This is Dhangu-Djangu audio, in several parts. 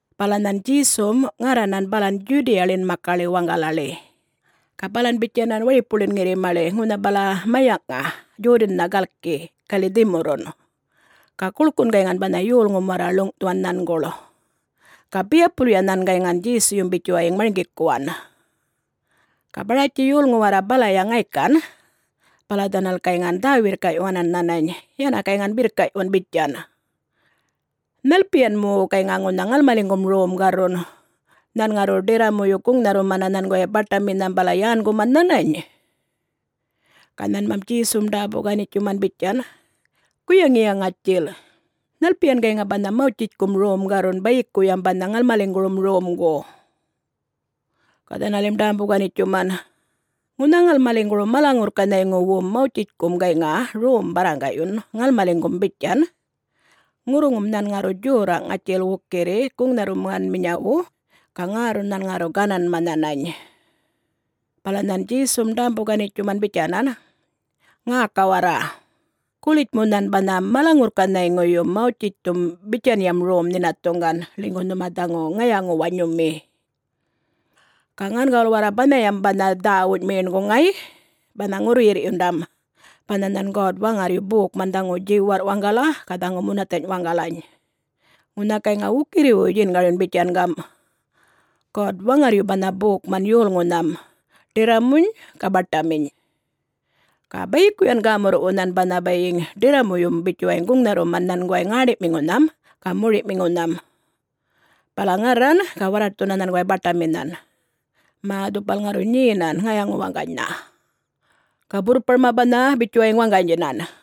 Bala nhan Djesum ŋarranan balan Djudiyaḻin makaḻi waŋgalaḻi. Ga balan bitjanan waripuḻin ŋirrimaḻi ŋunha bala mayaŋꞌŋa Djodannha galki galiꞌ dhimurrun. Ga guḻkun gayŋan banha yolŋum warra ḻuŋꞌthuwan nhanguḻ. Ga biyapulya nhan gayŋan Djesuyum bitjuwayiŋ marŋgikuwan. Ga Baratji yolŋu warra balaya ŋaykan bala dhanal gayŋan dhä-wirrkaꞌyuwanan nhanany, yäna gayŋan birrkaꞌyuwan, bitjan, “Nhalpiyan mu gayŋa ŋunha ŋalmaliŋgum rom garrun,... nhan ŋarru ḏirramuyu guŋnharrumana nhanguway baṯaminynham bala yänguman nhanany?” Ga nhanmam Djesum ḏämbu-ganitjuman bitjan, “Guyaŋiya ŋatjil, nhalpiyan gayŋa banha Mawtjitjkum rom garrun bayikuyam banha ŋalmaliŋgurum romgu?” Ga dhanalim ḏämbu-ganitjuman, “Ŋunha ŋalmaliŋguru mala-ŋurrkanhayŋuwum Mawtjitjkum gayŋa rom barraŋgaꞌyun ŋalmaliŋgum bitjan: Ŋurruŋum nhan ŋarru djorraꞌ ŋatjil wukirri guŋnharrumanminyawu, ga ŋärrun nhan ŋarru gananma nhanany.” Bala nhan Djesum ḏämbu-ganitjuman bitjanan, “Ŋäka warra! Gulitjmu nhan banha mala-ŋurrkanhayŋuyum Mawtjitjthum bitjanyam rom nhinathuŋgan, ḻinygu nhuma dhaŋu ŋayaŋu-wanyumi. Ga ŋangawul warra banhayam banha dhäwuny meṉguŋ ŋay, banha ŋurruyirrꞌyundam, banha nhan God-Waŋarryu bokman dhaŋu djiwarrꞌ waŋgala ga dhaŋu munathanyꞌ waŋgalany! Ŋunha gayŋa wukirriwuy djingaryun bitjan gamꞌ, ‘God-Waŋarryu banha bokman yolŋunham, ḏirramuny ga baṯaminy. Ga bayikuyan gämurruꞌwu nhan ŋarru banha ḏirramuyum bitjuwayiŋ guŋnharruman nhanguway ŋäṉḏiꞌmiŋunham ga moriꞌmiŋunham, bala ŋarran ga warraṯthuna nhanguway baṯaminhan, mä dhupal ŋarru nyenan ŋayaŋu-waŋganynha, ga burrparma banha bitjuwayiŋ waŋganydjinan.’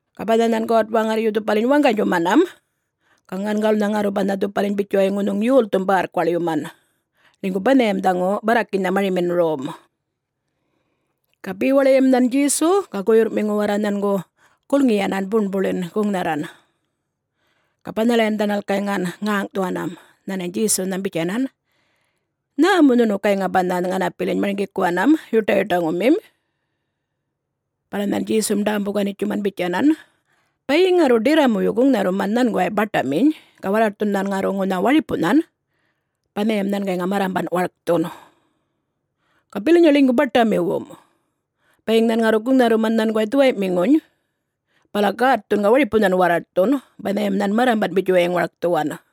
Ga banha nhan God-Waŋarryu dhupaliny waŋganydjumanam, ga ŋangawulnha ŋarru banha dhupaliny bitjuwayiŋ ŋunhuŋ yolthum bärrkuwaḻyuman, ḻinygu banhayam dhaŋu barrakinynha marimin rom!” Ga bewaḻiyam nhan Djesu ga guyurrꞌmiŋu warra nhangu gulŋiyanan buṉbuḻin guŋnharran. Ga banhalayan dhanal gayŋan ŋäŋꞌthuwanam nhanany Djesunham bitjanan, “Nhä mu nhunu gayŋan banha ŋanapiliny marŋgikuwanam yuṯayuṯaŋumim?” Bala nhan Djesum ḏämbu-ganitjuman bitjanan, “Bayiŋ ŋarru ḏirramuyu guŋnharruman nhanguway baṯaminy ga warraṯthun nhan ŋarru ŋunha waripunhan, banhayam nhan gayŋa marrambanꞌ warkthun. Ga bilanyaya ḻinygu baṯamiwum. Bayiŋ nhan ŋarru guŋnharruman nhanguway dhuwayꞌmiŋuny bala gätthun ga waripunhan warraṯthun, banhayam nhan marranbanꞌ bitjuwayiŋ warkthuwan.”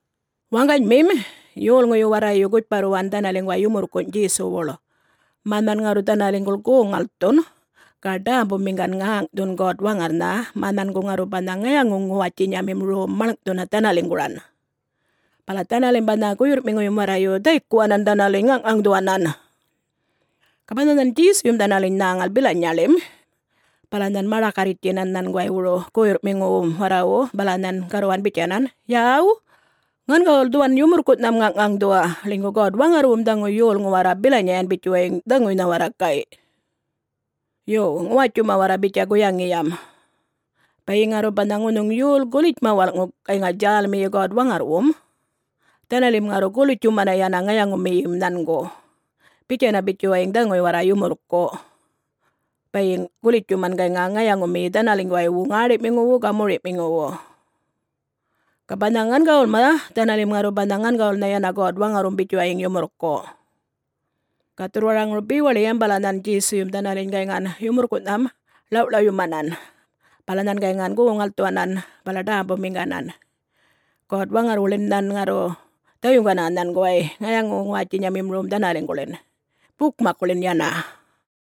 Waŋganymim, yolŋuyu warrayu gutjparruwan dhanaliŋguway yumurrkunyꞌ Djesuwuḻ, mä nhan ŋarru dhanaliŋguḻ goŋ-ŋalthun ga ḏämbumiŋgan ŋäŋꞌthun God-Waŋarrnha mä nhangu ŋarru banha ŋayaŋu-ŋuwatjinyamim rom maḻŋꞌthuna dhanaliŋguran. Bala dhanalim banha guyurrꞌmiŋuyum warrayu dhaykuwanan dhanaliny ŋaŋꞌŋaŋdhuwanan. Ga banha nhan Djesuyum dhanaliny nhäŋal bilanyaḻim bala nhan maḏakarritjtjinan nhanguwaywuru guyurrꞌmiŋuwum warrawu bala nhan garruwan bitjanan, “Yaw, ŋangawul dhuwan yumurrkuꞌnham ŋaŋꞌŋaŋdhuwa, ḻinygu God-Waŋarrwum dhaŋu yolŋu warra bilanyayan bitjuwayiŋ dhaŋuynha warra, gayꞌ. Yo, ŋuwatjuma warra bitja guyaŋiyam. Bayiŋ ŋarru banha ŋunhuŋ yol gulitjma walꞌŋu gayŋa djälmiyi God-Waŋarrwum, dhanalim ŋarru gulitjumana yana ŋayaŋumiyim nhangu, bitjana bitjuwayiŋ dhaŋuy warra yumurrkuꞌ bayiŋ gulitjuman gayŋa ŋayaŋumiyi dhanaliŋguwaywu ŋäṉḏiꞌmiŋuwu ga moriꞌmiŋuwu. Ga banha ŋangawulma, dhanalim ŋarru banha ŋangawulnha yana God-Waŋarrwum bitjuwayiŋ yumurrkuꞌ.” Ga dhurrwaraŋuru bewaḻiyam bala nhan Djesuyum dhanaliny gayŋan yumurrkuꞌnham ḻawꞌḻawyumanan, bala nhan gayŋan goŋ-ŋalthuwanan bala ḏämbumiŋganan God-Waŋarrwuḻin nhan ŋarru dhayuŋgana nhanguway ŋayaŋu-ŋuwatjinyamim rom dhanaliŋguḻin, bukmakkuḻin yana.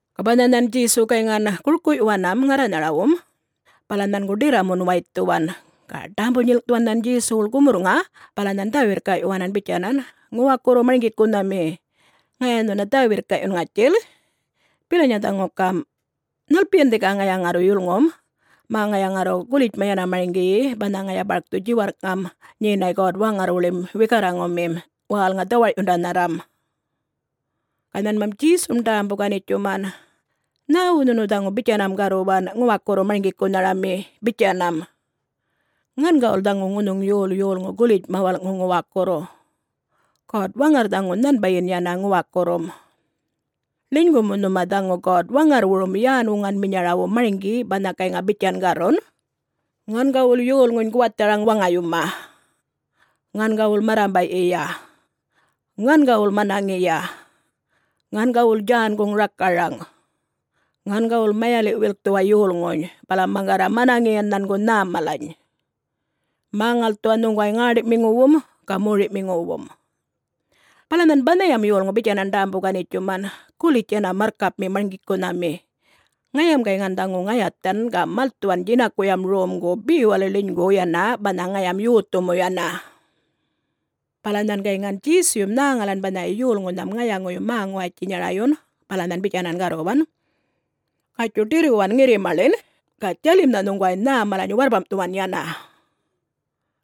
Ga banha nhan Djesu gayŋan gurkuꞌyuwanam ŋarranharawum, bala nhangu ḏirramun waythuwan. Ga ḏämbu-nyilŋꞌthuwan nhan Djesuwuḻ gumurrŋa bala nhan dhä-wirrkaꞌyuwanan bitjanan, “Ŋuwakurru Marŋgikunhami, ŋaya nhuna dhä-wirrkaꞌyun ŋatjil. Bilanya dhaŋu gamꞌ: Nhalpiyan dhika ŋaya ŋarru yulŋum, mä ŋaya ŋarru gulitjma yana marŋgiyi banha ŋaya barkthu djiwarrꞌŋam nyenay God-Waŋarrwuḻim wikarraŋumim, wälŋa-dhawarꞌyundanharran?” Ga nhanmam Djesum dämbu-ganitjuman, “Nhäwu nhunu dhaŋu bitjanam garruwan, ‘Ŋuwakurru Marŋgikunharami’?, bitjanam. Ŋangawul dhaŋu ŋunhuŋ yol yolŋu gulitjma walꞌŋu ŋuwakurru, God-Waŋarr dhaŋu nhanbayin yana ŋuwakurrum. Ḻinygu mu nhuma dhaŋu God-Waŋarrwurum yän-wuŋanminyarawu marŋgi banha gayŋa bitjan garrun, ‘Ŋangawul yolŋuny guwatharaŋ waŋayuma; Ŋangawul marrambaꞌyiya; Ŋangawul manaŋiya; Ŋangawul djänguŋ rakaraŋ; Ŋangawul mayaliꞌ-wilkthuwa yolŋuny, bala maŋgarra manaŋiyan nhangu nhäm malany; Mä-ŋalthuwa nhuŋguway ŋäṉḏiꞌmiŋuwum ga moriꞌmiŋuwum.’” Bala nhan banhayam yolŋu bitjanan ḏämbu-ganitjuman, “Gulitj yana marrkapmi Marŋgikunhami. Ŋayam gayŋan dhaŋu ŋayathan ga malthuwan djinakuyam romgu bewaḻi ḻinygu yana banha ŋayam yothu mu yana.” Bala nhan gayŋan Djesuyum nhäŋalan banhaya yolŋunham ŋayaŋuyum-mä-ŋuwatjinyarayun bala nhan bitjanan garruwan, “Gatjuy ḏirruwan ŋirrimaḻin ga djalimnha nhuŋguway nhäm malany warrpamꞌthuwan yana.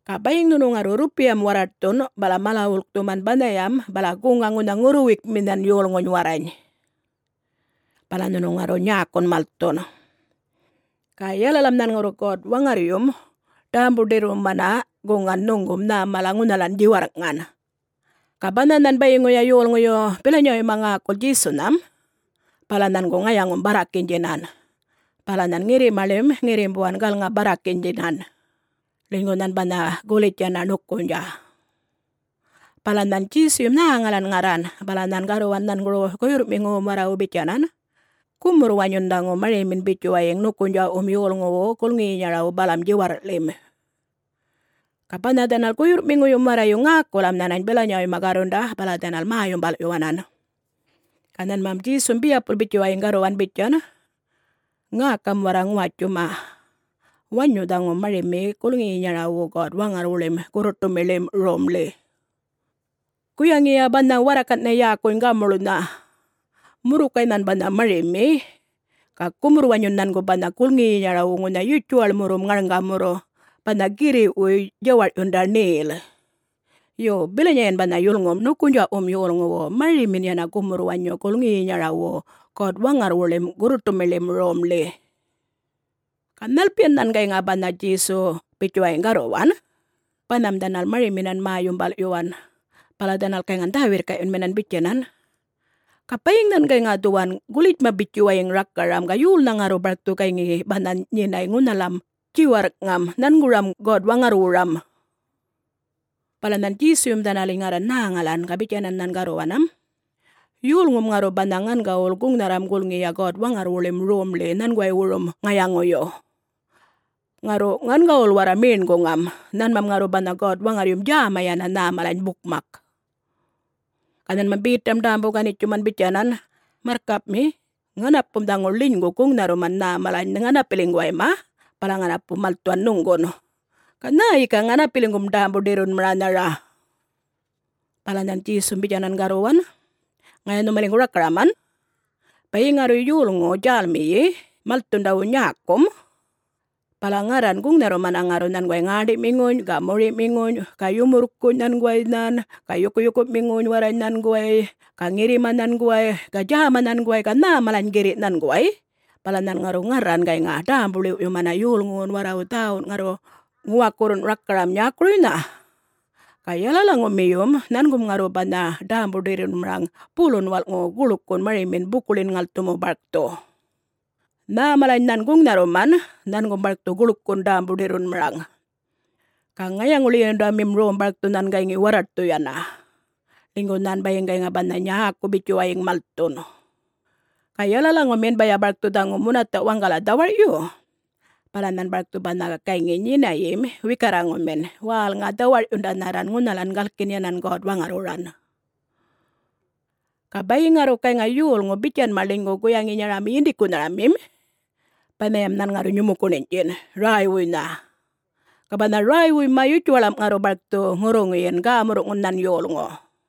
Ga bayiŋ nhunu ŋarru rrupiyam warraṯthun bala mala-wulkthuman banhayam, bala guŋa ŋunha ŋurruwuykminhan yolŋuny warrany. Bala nhunu ŋarru nyäkun malthun. Ga yalalam nhan ŋarru God-Waŋarryum ḏämbu-ḏirrumana guŋan nhuŋgum nhä mala ŋunhalan djiwarrꞌŋan.” Ga banha nhan bayiŋuya yolŋuyu bilanyawuyma ŋäkul Djesunham, bala nhangu ŋayaŋum-barrakinydjinan. Bala nhan ŋirrimaḻim ŋirrimbuwan galŋa-barrakinydjinan, ḻinygu nhan banha gulitj yana ṉukunydjaꞌ. Bala nhan Djesuyum nhäŋalan ŋarran, bala nhan garruwan nhanguru guyurrꞌmiŋuwum warrawu bitjanan, “Gumurr-wanyun dhaŋu marimin bitjuwayiŋ ṉukunydjaꞌwum yolŋuwu gulŋiyinyarawu balam djiwarrꞌḻim!” Ga banha dhanal guyurrꞌmiŋuyum warrayu ŋäkulam nhanany bilanywuyma garrunda bala dhanal mä-yumbalꞌyuwanan. Ga nhanmam Djesum biyapul bitjuwayiŋ garruwan bitjan, “Ŋäkam warra ŋuwatjuma! Wanyu dhaŋu marimi gulŋiyinyarawu God-Waŋarrwuḻim gurruṯumiḻim Romḻi. Guyaŋiya banha warrakanꞌnha yäkuny gamuḻnha. Murrukay nhan banha marimi, ga gumurr-wanyun nhangu banha gulŋiyinyarawu ŋunha yutjuwaḻmurrum ŋarŋgamurru, banha girriꞌwuy djawarꞌyunda ṉel. Yo, bilanyayan banha yulŋum ṉukunydjaꞌwum yolŋuwu, marimin yana gumurr-wanyu gulŋiyinyarawu God-Waŋarrwuḻim gurruṯumiḻim Romḻi.” Ga nhalpiyan nhan gayŋan banha Djesu bitjuwayiŋ garruwan, banham dhanal mariminan mä-yumbalꞌyuwan. Bala dhanal gayŋan dhä-wirrkaꞌyunminan bitjanan, “Ga, bayiŋ nhan gayŋa dhuwan gulitjma bitjuwayiŋ rakaram, ga yolnha ŋarru barkthu gayŋi banha nyenay ŋunhalam djiwarrꞌŋam nhanguram God-Waŋarrwuram?” Bala nhan Djesuyum dhanaliny ŋarran nhäŋalan, ga bitjanan nhan garruwanam, “Yolŋum ŋarru banha ŋangawul guŋnharram gulŋiya God-Waŋarrwuḻim Romḻi nhanguwaywurum ŋayaŋuyu. Ŋarru ŋangawul warra meṉguŋam, nhanmam ŋarru banha God-Waŋarryum djäma yana nhä malany bukmak.” Ga nhanmam Betam ḏämbu-ganitjuman bitjanan, “Marrkapmi. Ŋanapum dhaŋu ḻinygu guŋnharruman nhä malany ŋanapiliŋguwayma bala ŋanapu malthuwan nhuŋgun. Ga nhä yika ŋanapiliŋgum ḏämbu-ḏirrunmaranhara?” Bala nhan Djesum bitjanan garruwan, “Ŋaya nhumaliŋgu rakaraman! Bayiŋ ŋarru yolŋu djälmiyi malthundawu nyäkum, bala ŋarran guŋnharrumana ŋarru nhanguway ŋäṉḏiꞌmiŋuny ga moriꞌmiŋuny ga yumurrkunyꞌ nhanguway nhan ga yukuyukuꞌmiŋuny warrany nhanguway ga ŋirrima nhanguway ga djäma nhanguway ga nhä malany girriꞌ nhanguway, bala nhan ŋarru ŋarran gayŋa ḏämbu-ḻiwꞌyumana yolŋuwun warrawu dhäwun ŋarra ŋuwakurrun rakaram nyäkuruynha. Ga yalalaŋumiyum nhangum ŋarru banha ḏämbu-ḏirrunmaraŋ bulun walꞌŋu guḻkun marimin bukuḻin-ŋalthumu barkthu. Nhä malany nhan guŋnharruman, nhangum barkthu guḻkun ḏämbu-ḏirrunmaraŋ. Ga ŋayaŋu-ḻiyundamim rom barkthu nhan gayŋi warraṯthu yana, ḻinygu nhan bayiŋ gayŋa banha nyäku bitjuwayiŋ malthun. Ga yalalaŋumin baya barkthu dhaŋu munathaꞌ waŋgala dhawarꞌyu, bala nhan barkthu banha gayŋi nyinayim wikarraŋumin, wälŋa-dhawarꞌyundanharran ŋunhalan galkin yanan God-Waŋarrwuran. Ga bayiŋ ŋarru gayŋa yolŋu bitjanma ḻinygu guyaŋinyarami yindikunharamim, banhayam nhan ŋarru nyumukuṉinydjin, räywuynha. Ga banha räywuyma yutjuwaḻma ŋarru barkthu ŋurruŋuyin, gämurru'ŋun nhan yolŋu.”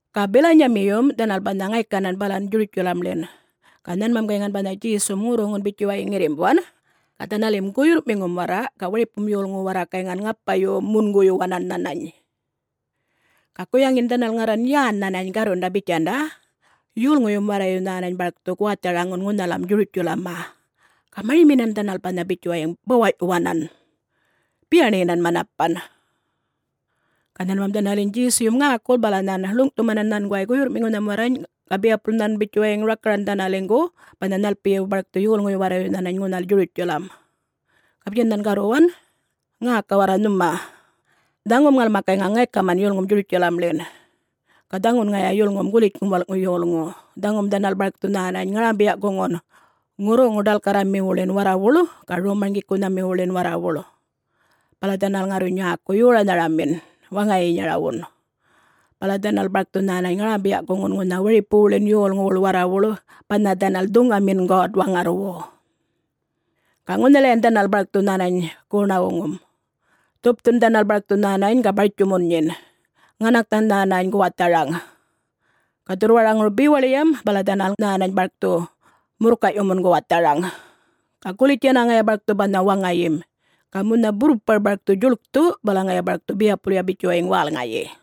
Ga bilanyamiyum dhanal banha ŋaykanan balan Djurutjalamḻin ga nhanmam gayŋan banha Djesum ŋurruŋun bitjuwayiŋ ŋirrimbuwan ga dhanalim guyurrꞌmiŋum warra ga waripum yolŋu warra gayŋan ŋapa-munguyuwanan nhanany. Ga guyaŋin dhanal ŋarran yän nhanany garrunda bitjanda, “Yolŋuyum warrayu nhänany barkthu guwatharaŋun ŋunhalam Djurutjalamma.” Ga mariminan dhanal banha bitjuwayiŋ bawaꞌyuwanam, biyaṉiyinan manapan. Ga nhanmam dhanaliny Djesuyum ŋäkul bala nhan ḻuŋꞌthumanan nhanguwayma guyurrꞌmiŋuny warrany ga biyapul nhan bitjuwayiŋ rakaran dhanaliŋgu banha nhalpiyu barkthu yolŋuyu warrayu nhanany ŋunhal Djurutjalam. Ga bitjan nhan garruwan, “Ŋäka warra nhuma! Dhaŋum ŋalma gayŋa ŋaykaman yulŋum Djurutjalamḻin. Ga dhaŋun ŋaya yulŋum Gulitjŋum Walꞌŋu Yolŋu, dhaŋum dhanal barkthu nhänany ŋarambiya-guŋun ŋurruŋu-ḏalkarramiwuḻin warrawuḻ ga rom-marŋgikunhamiwuḻin warrawuḻ. Bala dhanal ŋarru nyäku yoranharamin waŋayinyarawun. Bala dhanal barkthu nhänany ŋarambiya-guŋun ŋunha waripuwuḻin yolŋuwuḻ warrawuḻ, banha dhanal dhuŋanmin God-Waŋarrwu. Ga ŋunhalayan dhanal barkthu nhänany goṉa-wuŋum. Dhupthun dhanal barkthu nhänany ga bartjumun nyin, ŋanaknha nhänany guwatharaŋ. Ga dhurrwaraŋuru bewaḻiyam bala dhanal nhänany barkthu murrkayꞌyumun guwatharaŋ. Ga gulitj yana ŋaya barkthu banha waŋayim, ga munha burrpar barkthu djuḻkthu bala ŋaya barkthu biyapulya bitjuwayiŋ wälŋayi.”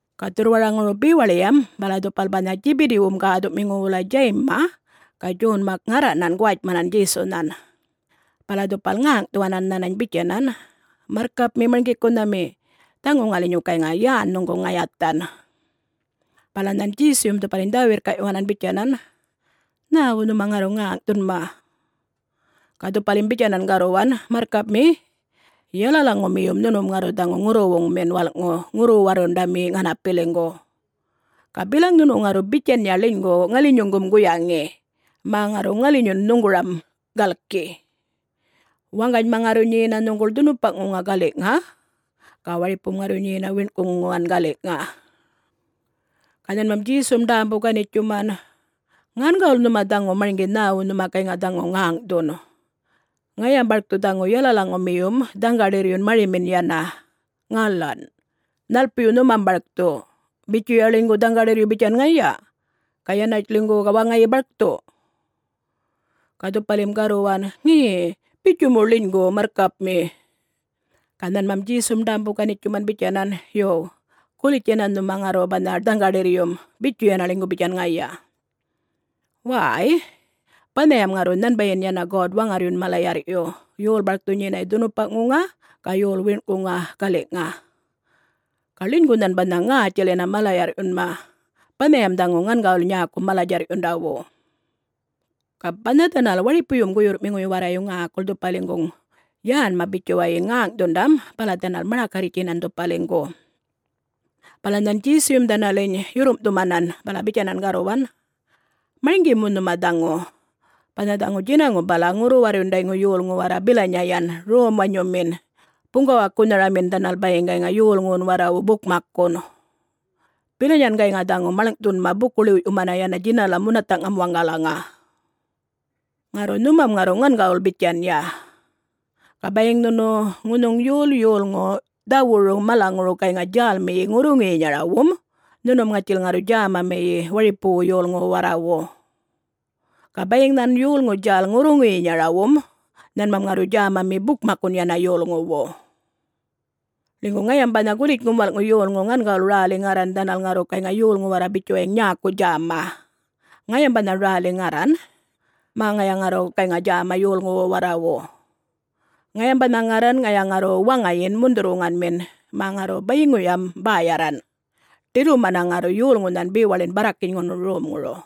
Ga dhurrwaraŋuru bewaḻiyam bala dhupal banha Djibidiwum gäthuꞌmiŋu wulay Djayimma ga Djonma ŋarranan guwatjmanan Djesunhan. Bala dhupal ŋäŋꞌthuwanan nhanany bitjanan, “Marrkapmi Marŋgikunhami, dhaŋu ŋalinyu gayŋa yän nhuŋgu ŋayathan.” Bala nhan Djesuyum dhupaliny dhä-wirrkaꞌyuwanan bitjanan, “Nhäwu nhuma ŋarru ŋäŋꞌthunma?” Ga dhupalim bitjanan garruwan, “Marrkapmi, yalalaŋumiyum nhunum ŋarru dhaŋu ŋurruwuŋmin walꞌŋu ŋurru-warrundami ŋanapiliŋgu. Ga bilaŋ nhunu ŋarru bitjanya ḻinygu ŋalinyuŋgum guyaŋi? Mä ŋarru ŋalinyun nhuŋguram galki. Waŋganyma ŋarru nyena nhuŋguḻ dhunupaꞌŋuŋa galiꞌŋa ga waripum ŋarru nyena wiṉꞌkuŋuŋan galiꞌŋa.” Ga nhanmam Djesum ḏämbu-ganitjuman, “Ŋangawul nhuma dhaŋu marŋgi nhäwu nhuma gayŋa dhaŋu ŋäŋꞌthun. Ŋayam barkthu dhaŋu yalalaŋumiyum dhaŋgaḏirryun marimin yana. Ŋalan? Nhalpiyu nhumam barkthu... bitjuya ḻinygu dhaŋgaḏirryu bitjan ŋaya, ga yanatj ḻinygu ga waŋayi barkthu?” Ga dhupalim garruwan, “Ŋe... bitju mu ḻinygu, Marrkapmi.” Ga nhanmam Djesum ḏämbu-ganitjuman bitjanan, “Yo, gulitj yana nhuma ŋarru banha dhaŋgaḏirryum, bitju yana ḻinygu bitjan ŋaya. Wäy-y, banhayam ŋarru nhanbayin yana God-Waŋarryun mala-yarrꞌyu, yol barkthu nyenay dhunupaꞌŋuŋa ga yol wiṉꞌkuŋa galiꞌŋa. Ga ḻinygu nhan banha ŋätjil yana mala-yarrꞌyunma. Banhayam dhaŋu ŋangawul nyäku mala-djarrꞌyundawu.” Ga banha dhanal waripuyum guyurrꞌmiŋuyu warrayu ŋäkul dhupaliŋguŋ yänma bitjuwayiŋ ŋäŋꞌthundam, bala dhanal maḏakarritjinan dhupaliŋgu. Bala nhan Djesuyum dhanaliny yurrumꞌthumanan bala bitjanan garruwan, “Marŋgi mu nhuma dhaŋu: banha dhaŋu djinaŋum bala ŋurru-warrundayŋu yolŋu warra bilanyayan, rom-wanyumin, buŋgawakunharamin dhanal bayiŋ gayŋa yolŋuwum warrawu bukmakkun. Bilanyan gayŋa dhaŋu maḻŋꞌthunma buku-ḻiwꞌyumana yana djinalam munathaꞌŋam waŋgalaŋa. Ŋarru nhumam ŋarru ŋangawul bitjanya. Ga bayiŋ nhunu ŋunhuŋ yol yolŋu dhawuru malaŋuru gayŋa djälmiyi ŋurruŋuyinyarawum, nhunum ŋatjil ŋarru djämamiyi waripuwu yolŋuwu warrawu. Ga bayiŋ nhan yolŋu djäl ŋurruŋuyinyarawum, nhanmam ŋarru djämami bukmakkun yana yolŋuwu. Ḻinygu ŋayam banha Gulitjŋum Walꞌŋu Yolŋu ŋangawul räli ŋarran dhanal ŋarru gayŋa yolŋu warra bitjuwayiŋ nyäku djäma. Ŋayam banha räli ŋarran, mä ŋaya ŋarru gayŋa djäma yolŋuwu warrawu. Ŋayam banha ŋarran ŋaya ŋarru waŋayin mundhurr-wuŋanmin, mä ŋarru bayiŋuyam bäyarran, ḏirrumana ŋarru yolŋunhan bewaḻin barrakinyŋurun romŋuru.”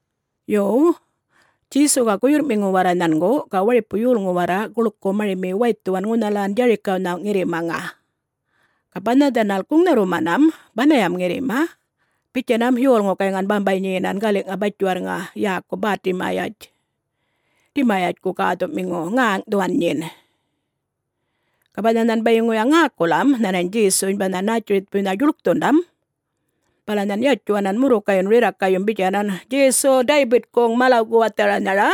Yo, Djesu ga guyurrꞌmiŋu warra nhangu ga waripu yolŋu warra guḻku marimi waythuwan ŋunhalan Djarikawnha ŋirrimaŋa. Ga banha dhanal guŋnharrumanam banhayam ŋirrima, bitjanam yolŋu gayŋan bambay nyenan galiꞌŋa batjiwarrŋa yäku Bätimayatj, Dimayatjku gäthuꞌmiŋu, ŋäŋꞌthuwan nyin. Ga banha nhan bayiŋuya ŋäkulam nhanany Djesuny banha Nätjiritjpuynha djuḻkthundam, bala nhan yatjuwanan murrukayyun rirrakayyum bitjanan, “Djesu, Daybitkuŋ mala-guwatharanhara,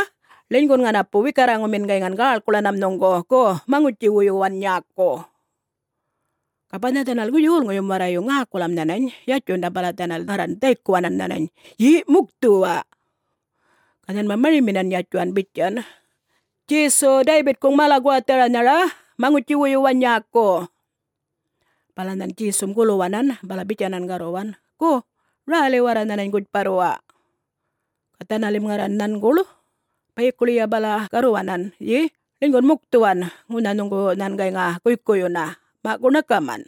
ḻinygun ŋanapu wikarraŋumin gayŋan gäḻkuḻanam nhuŋgu. Gu, maŋutji-wuyuwan nyäku.” Ga banha dhanal yolŋuyum warrayu ŋäkulam nhanany yatjundam bala dhanal ŋarran dhaykuwanan nhanany, “Ye,... mukthuwa!” Ga nhanmam mariminan yatjuwan bitjan, “Djesu! Daybitkuŋ mala-guwathanhara maŋutji-wuyuwa nyäku!” Bala nhan Djesum guluwanan bala bitjanan garruwan, “Gu, räli warra nhanany gutjparruwa!” Ga dhanalim ŋarran nhanguḻ, bayikuḻiya bala garruwanan, “Ye, ḻinygun mukthuwan. Ŋunha nhuŋgu nhan gayŋa guykuyyuna. Maꞌ, gu ṉakaman!”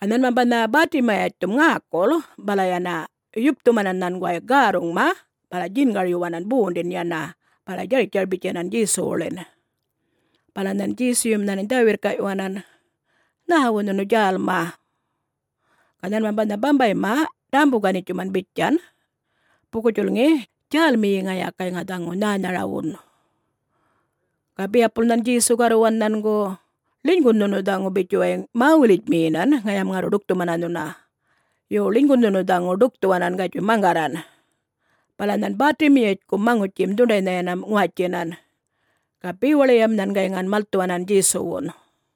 Ga nhanmam banha Bätimayatjthum ŋäkul bala yana yupthumanan nhanguway gärruŋma bala djingaryuwanan bondin yana, bala djartjar-bitjanan Djesuwuḻin. Bala nhan Djesuyum nhanany dhä-wirrkaꞌyuwanan, “Nhäwu nhunu djälma?” Ga nhanmam banha bambayma ḏämbu-ganitjuman bitjan, “Buku-djulŋi, djälmiyi ŋaya gayŋa dhaŋu nhänharawun.” Ga biyapul nhan Djesu garruwan nhangu, “Ḻinygun nhunu dhaŋu bitjuwayiŋ mä-wulitjmiyinan, ŋayam ŋarru ḏukthumana nhuna. Yo, ḻinygun nhunu dhaŋu dukthuwanan, gatjuy maŋgarran!” Bala nhan Bätimayatjkum maŋutjim dhuṉḏaynha yana ŋuwatjinan. Ga bewaḻiyam nhan gayŋan malthuwanan Djesuwun.